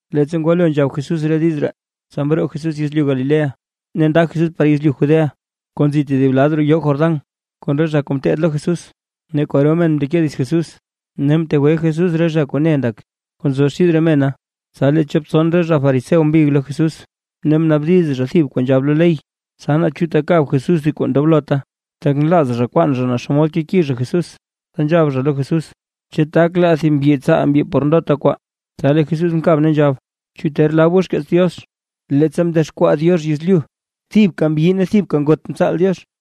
Leettsa ngwalo nzhab Jesús re diiz ree, tsa mroo Jesús yezlyu Galilea, ne nda Jesús par yezlyu Judea kuu nzi tedib lad roo yoo Jordán, kon re zha kuu ngeteed lo Jesús. Ne kwaro men mndeke dits Jesús, ne mtegwe Jesús re zha kuu ne ndak, kuu nzo xid re mena. Tsa lee chop tson zha fariseo mbig lo Jesús, ne mnaabdiz zha thib kuu nzhab lo ley, tsa naa chu takab Jesús thib kuu ndoblot, tak nlaaz zha kwaan zha naa xomod keki zha Jesús, tsa nzhab zha lo Jesús: ―¿Chu tak laa thib mbyi tsaal mbyi por ndota kwaa? Tsa lee Jesús mkab ne nzhab: ―¿Chu ter lab goo lo xkeets Diox, leettsa mdexkwaa Diox yezlyu, thibka mbyi ne thibka ngot mtsaal Diox?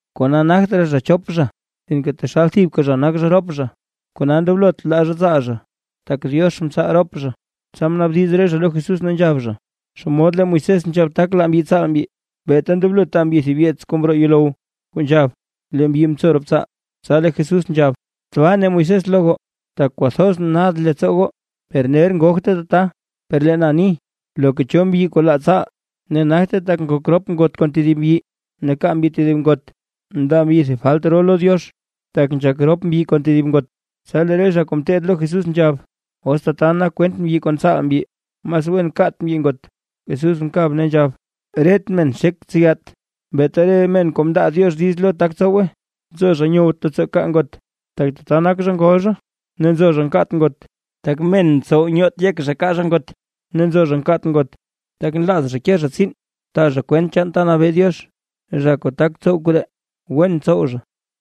Kona nagt raa zha chop zha, sinke taxal thibka zha nak zha rop zha. Kona ndoblot laa zha tsaal zha, tak Diox mtsaal rop zha. Tsa mnaabdiz re zha lo Jesús ne nzhab zha: ―¿Xomod lee Moisés nzhab tak laa mbyi tsaal mbyi, beeta ndoblo taa mbyi thib yeets kuu mroo yuulow kuu nzhab, lee mbyi mtso rop tsaal? Tsa lee Jesús nzhab: ―Tbaa mne Moisés lo goo, tak kwathoz nad leettsoo goo, per ner ngogte tata. Per lee na ni, loka cho mbyi kuu laa tsaal, ne nagte tak ngok rop ngot kon tedib mbyi, ne kaa mbyi tedib ngot, ndaa mbyi thib falt ro lo Diox, tak nzhak rop mbyi kon tedib ngot. Tsa lee re zha kuu ngeteed lo Jesús nzhab: ―Os tata nak kwent chaan mbyi kon tsaal mbyi, mas wen kat mbyi ngot. Jesús mkab ne nzhab: ―Ret men nxek ntseyat, beeta re men kuu mndaa Diox diiz lo tak tsowe. Nzo zha nyowt leettsoo kaa ngot, tak tata nak zha ngol zha, ne nzo zha nkaat ngot, tak men mtsow nyoot yek zha kaa zha ngot, ne nzo zha nkaat ngot, tak nlaaz zha ke zha tsiin taa zha kwent chaan ta nabee Diox. Zha kuu tak tsow koree, wen ntsow zha.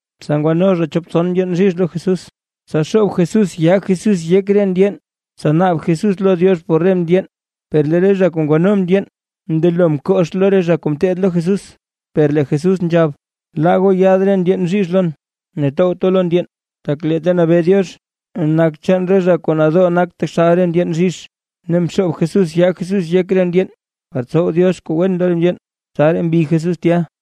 Tsa ngwano zha chop tson ndyeen bzhizh lo Jesús, tsa xoob Jesús yaa Jesús yek re ndyeen, tsa naab Jesús lo Diox por re ndyeen. Per lee re zha kuu ngwano ndyeen mndelo mkox lo re zha kuu ngeteed lo Jesús. Per lee Jesús nzhab: ―Laa goo yaad re ndyeen bzhizh lon, ne towt goo lo re ndyeen, tak lee ta nabee Diox, nak chaan re zha kuu nadoo nak taxal re ndyeen bzhizh. Ne mxoob Jesús yaa Jesús yek re ndyeen, par tsow Diox kuu wen lo re ndyeen. Tsaraa mbi Jesús tya.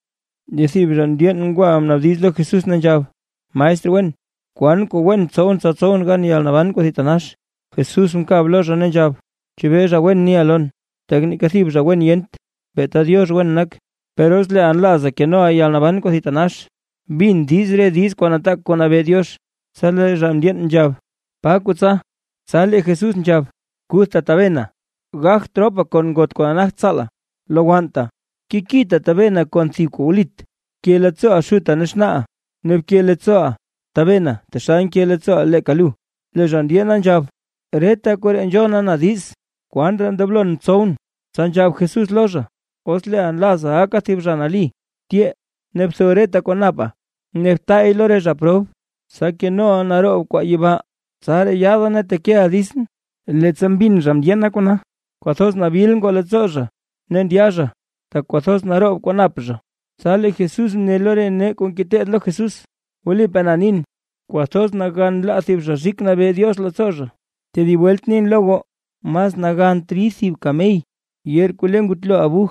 Lee thib zha mndyeen ngwa mnaabdiz lo Jesús ne nzhab: ―Maestr wen, ¿kwan kuu wen tsowʼn tsa tsowʼn gan yalnaban kuu thitanax? Jesús mkab lo zha ne nzhab: ―¿Chebee zha wen niʼa lon? Tak neeka thib zha wen yent, beeta Diox wen nak. Per os leeʼa nlaaza kenoʼa yalnaban kuu thitanax, bin diiz re diiz kuu nataak kuu nabee Diox. Tsa lee zha mndyeen nzhab: ―¿Pa kuu tsa? Tsa lee Jesús nzhab: ―Kuthta tabena, gagt ropa kon ngot kuu nagt tsaala, lowannta, kekita tabena kon thib kuu wlit, bke leettsooʼa xuta ne xnaaʼa, ne bke leettsooʼa tabena taxal nke leettsooʼa leeka lu. Lee zha mdyeena nzhab: ―Reta koree nzhona na diiz. ¿Kwan raa ndoblon tsowʼn? Tsa nzhab Jesús lo zha: ―Os leeʼa nlaaza gaka thib zha nali, tyee ne btho reta kwaa napa ne btaay lo re zha prob, tsa kenoʼa naroob kwaa yibaa; tsaraa yaada ne tekeʼa ditsʼn. Leettsa mbin zha mndyeen kona, kwathoz nabil ngoo leettsoo zha ndya zha, tak naroob kwaa nap zha. Tsa lee Jesús mne lo re nee kuu ngeteed lo Jesús: ―Wlipaa na nin, kwathoz nagan laa thib zha rik nabee Diox leettsoo zha. Tedib welt nin lo goo, mas nagant rid thib kamey yeer kuu le ngutlo abuj,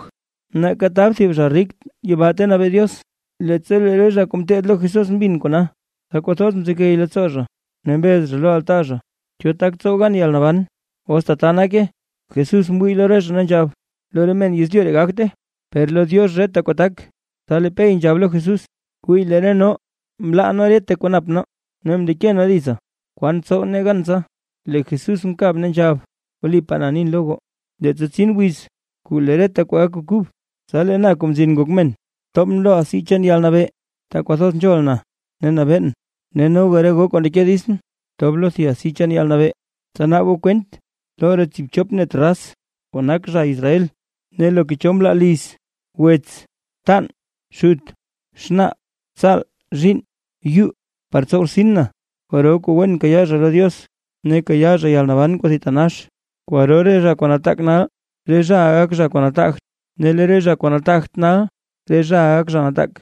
nake tab thib zha rik yibaa ta nabee Diox. Leettsa lee re zha kuu ngeteed lo Jesús mbin kona, tsa kwathoz mzegey leettsoo zha ne mbez zha lo altaa zha: ―¿Cho tak tsow gan yalnaban, os tata nake? Tsa mwii Jesús lo re zha ne nzhab Jesús: ―Lo re men yezlyu ree gagte, per lee lo Diox reta kuu tak. Tsa lee Pey nzhab lo Jesús: ―Wii lee re nee. Mlaa nee reta kuu nap nee ne mndeke nee ditsa. ¿Kwan tsow nee gan tsa? Lee Jesús mkab ne nzhab: ―Wlipaa na nin lo goo, leettsa tsin wiz kuu lee reta kwaa gak kuu kub, tsa lee na Kuu Mzin Ngon Men, tobʼn lo asi chaan yalnabee, ta kwathoz nzhol na ne nabeen, noga re goo kuu ndeke ditsʼn, tob lo thib asi chaan yalnabee, tsa naab goo kwent lo re tsiibchop net raz kuu nak zha Israel. Ne loka cho mlaa liz, wets, btan, xut, xnaa, tsaal, zhiinn, yu, par tsow rtsin na, kwaro kuu wen kayaa zha lo Diox ne kayaa zha yalnaban kuu thitanax. Kwaro re zha kuu nataak nal, re zhaʼa gak zha kuu nataagt, ne lee re zha kuu nataagt nal, re zhaʼa gak zha nataak.